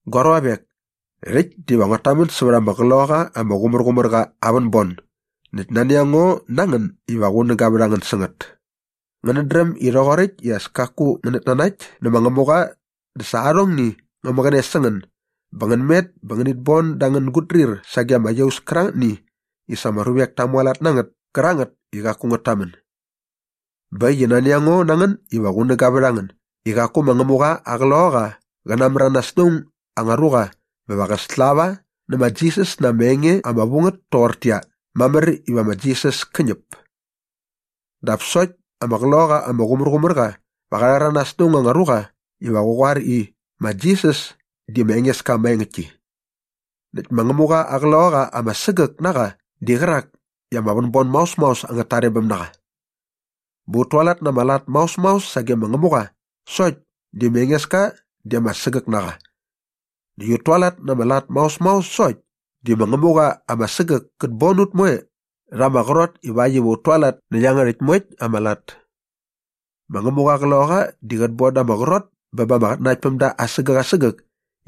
Gua ruavek, rhäkt diva nguat tamän sävät ama Qloqaqa ama Qumärqumärqa aa vänbon näkt nani a ngo na ngän iva qunäga vät a ngän sä ngät. Ngänät dräm i rhoqoräkt i as kaku ngänät nanakt nä ma Ngämuqa dä sa arhongni ngä mäqäne sä ngän bä ngän met bä ngänit bon da angän gutdrir sage ama iaus kärangätni i sa ama ruvek ta mualat na ngät kärangät i qaku ngät tamän. Bä äkt i nani a ngo na ngän iva qunäga vät a ngän i qaku ma Ngämuqa aa Qloqaqa qä namäranas na aung anga ruqa bä va qä slava nä ma Jisas na ama enge ama vu ngät toqortäqyia, “Mamär iva ma Jisas kä ñäp.” Dap sokt ama Qloqaqa ama Qumärqumärqa va qa rhäranas na aung anga ruqa iva qä qoar i, “Ma Jisas di ma Engeska maengäktki.” Näkt ma Ngämuqa aa Qloqaqa ama sägäk na qa di qärak i ama vänbon maos maos angät tarebäm na qa. Bä ut tualat na ama lat maos maos sage ma Ngämuqa sokt di ma Engeska di ama sägäk na qa näkt ut tualat na ama lat maos maos sokt di ma Ngämuqa ama sägäk kät bon ut moe rha ama qrot ivakt iva ut tualat nä iangärhäkt moekt ama lat. Ma Ngämuqa aa Qloqaqa di qät bon da ama qrot bä ba ama qatnanaktpämda asägäk asägäk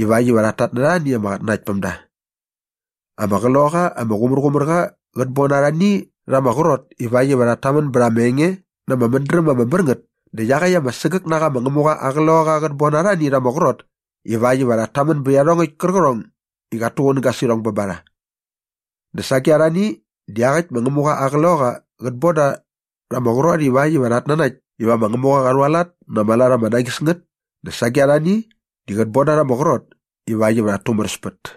ivakt iva qat tatnärha arhani ama qatnanaktpämda. Ama Qloqaqa ama Qumärqumärqa qät bon arhani rha ama qrot ivakt iva rhat tamän bät ama enge na ama mädräm ama mär ngät dä iaqäkt ama sägäk na qa ma Ngämuqa aa Qloqaqa qät bon arhani rha ama qrot ivakt iva rhat tamän bät iarhongäkt kärqärhong i qat tuqunäga sä irhong bä ba rha. Dä sage arhani di iaqäkt ma Ngämuqa aa Qloqaqa qät bon da rha ama qrot ivakt iva rhat nanakt iva ma Ngämuqa qa rhualat na ama lat ama nañis ngät dä sage arhani di qät bon da rha ama qrot ivakt iva rhat tumäräspät.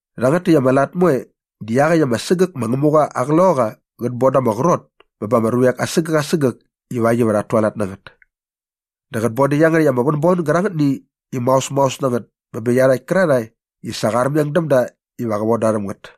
Rhangät täkt ama lat moe di iaqäkt ama sägäk ma Ngämuqa aa Qloqaqa qät bon da ama qrot bä bä ama ruvek asägäk asägäk ivakt iva rhat tualat na ngät. Dä qät bon dä iangärhäkt ama vänbon gärangätni i maosmaos na ngät bä bä iarhakt kärarhae i sa qa armeng däm da iva qä von da rhäm ngät.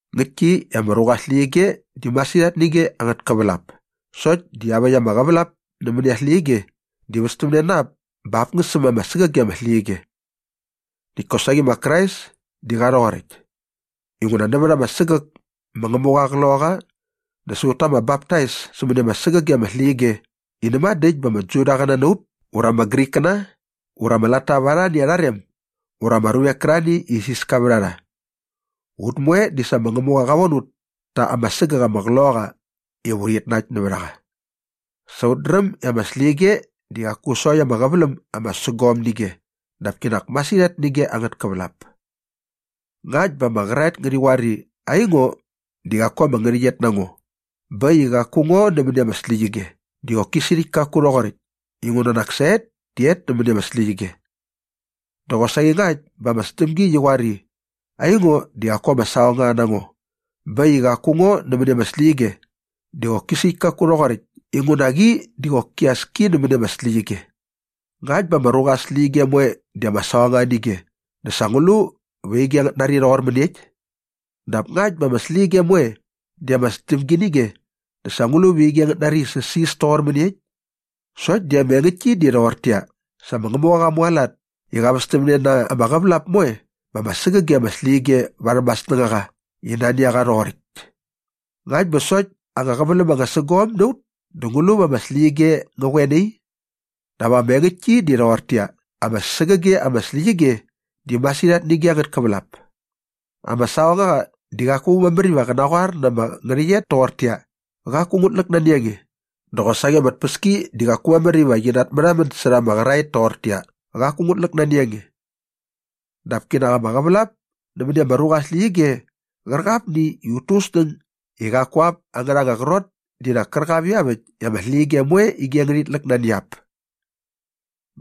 Ngäktki i ama ruqa aa släqyige di masirhat nä ige angät kävälap sokt di iaväkt ama qävälap nämäni aa släqyige di västämne na ap bä ap ngä säm ama sägäge ama släqyige. Näkt kosaqi ma Krais di qa rhoqoräkt. Inguna nävät ama sägäk ma Ngämuqa aa Qloqaqa dä sa ut ta ama baptais sämäni ama sägäge ama släqyige i näma dä äkt bä ama Judaqäna na ut ura ama Grikkäna ura ama latta va arhani arha rem ura ama ruvek kärarhani i isiska vät a rha. Ut moe di sa ma Ngämuqa qa von ut ta ama sägäk aa Qloqaqa iva urhit nakt nävät a qa. Sa ut dräm i ama släqyige di qaku sokt ama qäväläm ama sägom nä ige dap kinak masirhat nä ige angät kävälap. Ngakt bä ama qäraet ngärhi qoar i, “Aingo di qaku ama ngärhäqyet na ngo bä äkt i qaku ngo nämäni ama släqyige” dä qoki sirhäkt kaku rhoqoräkt inguna nak sa et di et nämäni ama släqyige. Dä qosaqi ngakt bä ama sdämgi qi qoar i, “Aingo di qaku ama saqongaqa na ngo bä äkt i qaku ngo nämäni ama släqyige” dä qoki sirhäkt kaku rhoqoräkt inguna qi di qoki as ki nämäni ama släqyige. Ngakt bä ama ruqa aa släqyige moe di ama saqongaqa nä ige dä sa ngu lu va ige ngät nari rhoqor mäniekt? Dap ngakt bä ama släqyige moe di ama sdämgi nä ige dä sa ngu lu va ige ngät nari i säsis toqor mäniekt? Sokt di ama engäktki di rhoqortäqyia, sa ma Ngämuqa qa mualat i qa västämne na ama qävälap moe bä ma ama sägäge ama släqyige varhäm aa snängaqa i nani a qa iva rhoqoräkt. Ngakt bä sokt anga qäväläm anga sägom na ut dä ngu lu va ama släqyige ngä qoe nai? Dap ama engäktki di rhoqortäqyia, ama sägäge ama släqyige di masirhat nä ige angät kävälap. Ama saqongaqa di qaku mamär iva qä naqoar na ama ngärhäqyet toqortäqyia, “Qaku ngut läk nani a nge” dä qosaqi ama tpäski di qaku mamär iva qi natmärhamän särha ama qäraet toqortäqyia, “Qaku ngut läk nani a nge.” Dap kinak ama qävälap nämäni ama ruqa aa släqyige qärqapni i ut tu ut snäng i qaku ap angärha anga qrot di nak kärqap iaväkt i ama släqyige moe di ige ngärhit läk nani ap.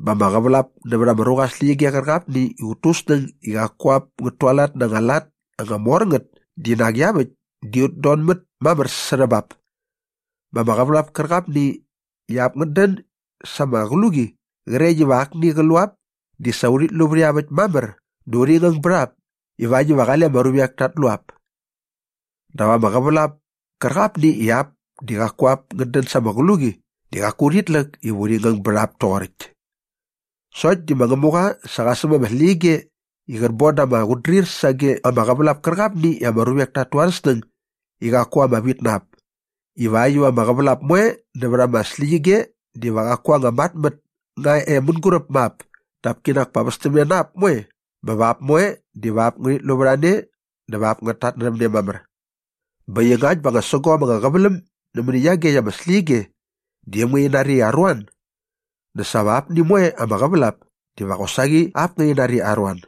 Bä ama qävälap nävät ama ruqa aa släqyige qärqapni i ut tu ut snäng i qaku ap ngät tualat na anga lat anga mor ngät di nak iaväkt di ut donmät mamär särhä bap. Bä ama qävälap kärqapni i ap ngät dän sa ama qluqi qrekt iva akni qat lu ap di sa urhit lu vät iaväkt mamär dä urhi ngäng bät ap ivakt iva qale ama ruvek tat lu ap. Dap ama qävälap kärqapni i ap di qaku ap ngät dän sa ama qluqi di qaku urhit läk iva urhi ngäng bät ap toqoräkt. Sokt di ma Ngämuqa sa qa säm ama släqyige i qät bon da ama qutdrir sage ama qävälap kärqapni i ama ruvek tat tu arhä snäng i qaku ama vit na ap ivakt iva ama qävälap moe nävät ama släqyige diva qaku anga matmät nga e mänguräp ma ap dap kinak pa västämne na ap moe bä va ap moe diva ap ngärhit lu vät a ne dä va ap ngät tatnärhäm ne mamär. Bä äkt i ngakt bä anga sägom anga qäväläm nämäni iagekt ama släqyige di äm ngärhi nari i aruan dä sa va apni moe ama qävälap diva qosaqi ap ngärhi nari i aruan.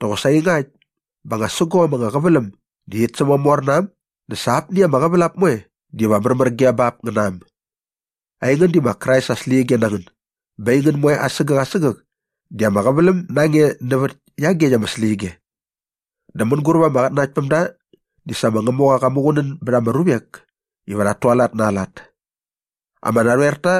Dä qosaqi ngakt bä anga sägom anga qäväläm di rhit sämamor na äm dä sa apni ama qävälap moe diva märmär ge bap ngä na äm. Aingän di ma Krais aa släqyige na ngän bä aingän moe asägäk asägäk di ama qäväläm na nge nävät iagekt aa släqyige. Dä mänguräp ama qatnanaktpämda di sa ma Ngämuqa qa muqunän bät ama ruvek iva rhat tualat na aa lat. Ama narhoer ta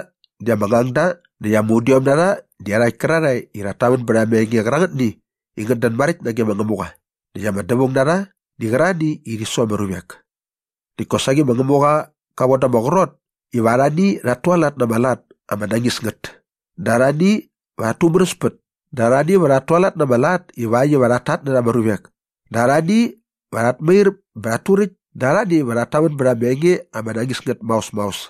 di ama ngangda näkt ama udiom na rha di iarhakt kärarhae i rhat tamän bät ama enge qärangätni i ngät dän maräkt nage ma Ngämuqa näkt ama dävaung na rha di qärarhani i rhi su ama ruvek. Näkt kosaqi ma Ngämuqa qa von da ama qrot iva arhani rhat tualat na ama lat ama nañis ngät dä arhani va rhat tumäräspät dä arhani va rhat tualat na ama lat ivakt iva rhat tatnärha ama ruvek dä arhani va rhat mair bä rhat turäkt dä arhani va rhat tamän bät ama enge ama nañis ngät maos maos.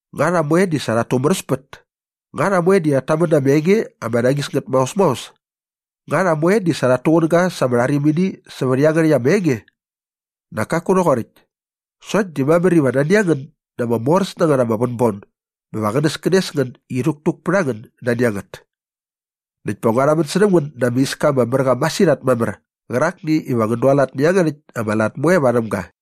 Nga rha moe di sa rhat tumäräspät? Nga rha moe di rhat tamän na ama enge ama nañis ngät maos maos? Nga rha moe di sa rhat tuqunäga sa ama rharimini sävät iangärhäkt ama enge? Nak kaku rhoqoräkt. Sokt di mamär iva nani a ngän na ama moräs na ngät ama vänbon bä va qänäskänes ngän i rhäktuk pät a ngän nani a ngät. Näkt pa ngua rhamän särhäm ngän na ama iska ama mär qa masirhat mamär qärakni iva ngän dualat nä iangärhäkt ama lat moe varhäm ga.